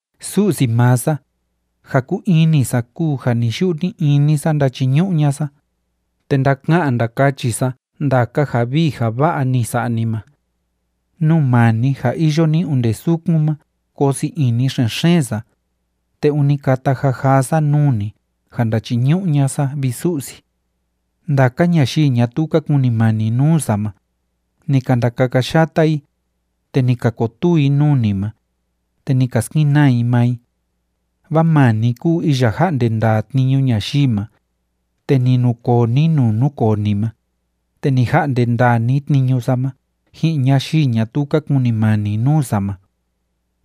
Su'si maa sa, ja kúu ini sa kúu ja ni‑yu'u ni‑ini sa ndachiñu'u ña'a sa, te ndaka'an ndakachi sa ndaka ja vii ja va'a ni sa'a ni ma. Nuu maa ni ja iyo ni onde sukun ma koo sii ini xen‑xeen sa, te ûni kata jajaa sa nuu ni ja ndachiñu'u ña'a sa, vi Su'si. Ndaka ñayii ñatuu ka kunimani nuu sa ma, ni ka ndakakayata i, te ni ka kotuu i nuu ni ma, te ni ka skenaa i maa i. Vaa maa ni kúu iya ja'nde ndaa tniñu ñayii ma, te ni nukoo ni nuu núkoo ni ma, te ni ja'nde ndaa ni tniñu sa ma ji'in ñayii ñatuu ka kunimani nuu sa ma.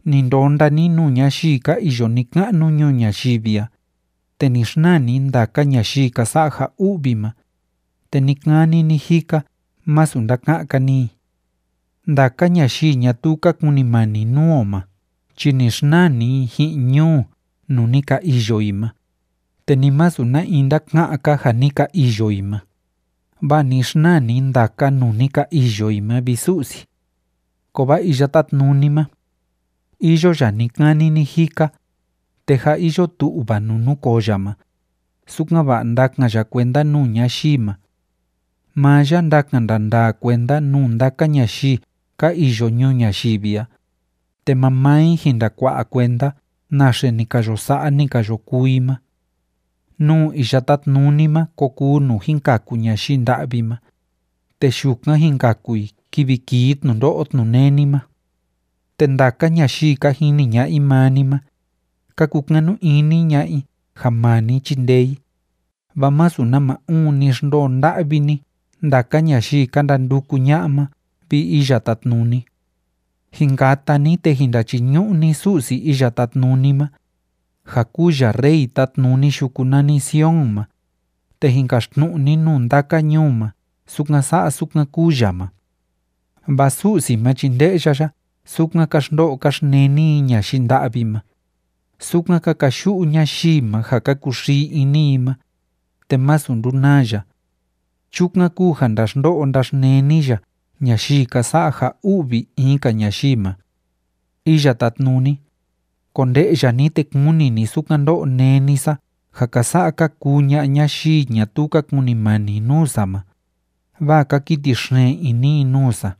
Ni ndonda ni nuu ñayii ka iyo ni‑ka'nu ñuu ñayivi a, te ni xnaa ni ndaka ñayii ka sa'a ja u'vi ma, te ni‑kani ni‑jika masu ndaka'án‑ka ni i. Ndaka ñayii ñatuu ka kunimani nuu o ma chi ni xnaa ni i ji'in ñuu nuu ni ka iyo i ma, te ni masu na in ndaka'án‑ka ja ni ka iyo i ma, vaa ni xnaa ni ndaka nuu ni ka iyo i ma, vi Su'si. Kovaa Iya Tátnuni ma, iyo ya ni‑kani ni‑jika, te jâ iyo tu'va nuu núkoo ya ma, sukan‑va'a ndakan ya kuenda nuu ñayii ma. Maa ya ndakan ndandaa kuenda nuu ndaka ñayii ka iyo ñuu ñayivi a, te mamaa i jin ndakua'a kuenda naxe ni ka yo sa'a, ni ka yo kuu i ma. Nuu Iya Tátnuni ma ko kuu nuu jin kaku ñayii nda'vi ma, te yukan jin kaku i kivi kii tnundo'o tnuneni ma. Te ndaka ñayii ka jini ña'a i maa ni ma, ka kukanu ini ña'a i ja maa ni chindee i, vaa masu nama uun ni xndoo nda'vi ni ndaka ñayii ka ndanduku ña'a ma, vi Iya Tátnuni. Jin kata ni, te jin ndachiñu'u ni Su'si Iya Tátnuni ma, ja kúu ya Rey tátnuni yuku nani Sion ma, te jin kaxtnu'u ni nuu ndaka ñuu ma sukan sa'a sukan kúu ya ma. Vaa Su'si ma chi nde'ya ya sukan ka xndo'o ka xneni i ñayii nda'vi ma, sukan ka kayu'u ñayii ma ja ka kuxii ini i ma, te masu ndunaa ya. Chukan kúu ja ndaxndo'o ndaxneni ya ñayii ka sa'a ja u'vi in‑ka ñayii ma. Iya Tátnuni, konde'ya ni te kuni ni sukan ndó'o néni sa ja ka sa'a ka kuu ña'a ñayii ñatuu ka kunimani nuu sa ma, vaa ka kiti xeen ini i nuu sa.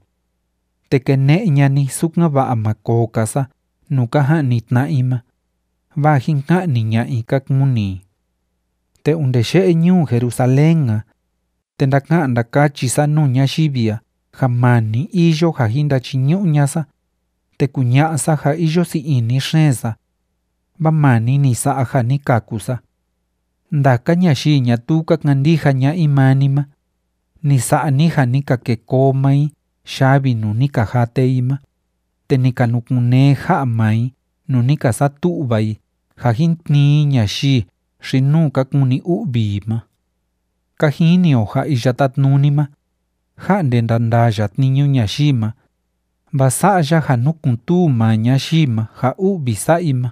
Te kene'e ña'a ni, sukan‑va'a ma koo‑ka sa nuu ka ja'ni tna'a i ma, vaa jin ka'ni ña'a i ka kuni i. Te onde ye'e ñuu Jerusalén a, te ndaka'an ndakachi sa nuu ñayivi a ja maa ni iyo ja jin ndachiñu'u ña'a sa, te kuña'a sa ja iyo sii ini xeen sa, vaa maa ni ni sa'a ja ni kaku sa. Ndaka ñayii ñatuu ka kandija ña'a i maa ni ma, ni sa'a ni ja ni ka kêe koo maa i yavi nuu ni ka jate i ma, te ni ka nukun‑nee ja'a maa i nuu ni ka satu'va i ja jin tnii i ñayii xi‑nuu ka kuni u'vi i ma. Ka jini o ja Iya Tátnuni ma, ja'nde ndandaa ya tniñu ñayii ma, vaa sa'a ya ja núkun‑tuu maa ñayii ma ja u'vi sa'a i ma.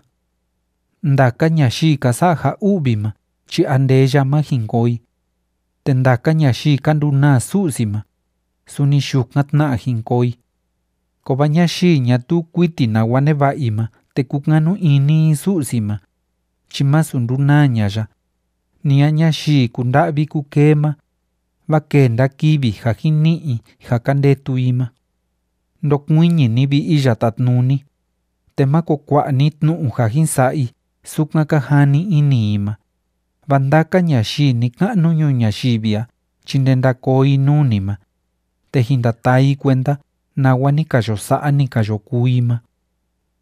Ndaka ñayii ka sa'a ja u'vi ma chi andeya ma jin koo i. Te ndaka ñayii ka ndunaa Su'si ma, suni yukan tna jin koo i. Kovaa ñayii ñatuu kuiti nawa neva'a i ma te kúkanu ini i Su'si ma, chi másu ndunaa ña'a ya, ni a ñayii kunda'vi kukee ma, vaa kenda kivi ja jin ni'i i ja ka ndetu i ma. Ndokuiñi ni, vi Iya Tátnuni, te máko kua'a ni tnu'u ja jin sa'a i sukan ka jani ini i ma, vaa ndaka ñayii ni‑ka'nu ñuu ñayivi a chi ndenda koo i nuu ni ma, te jin ndataa i kuenda nawa ni ka yo sa'a, ni ka yo kuu i ma.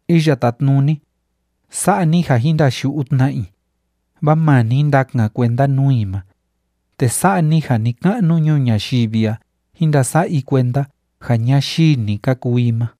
Iya Tátnuni, sa'a ni ja jín ndayu'u tna i, vaa maa ni ndakan kuenda nuu i ma, te sa'a ni ja ni‑ka'nu ñuu ñayivi a jín ndasa'a i kuenda ja ñayii‑ni ka kuu i ma.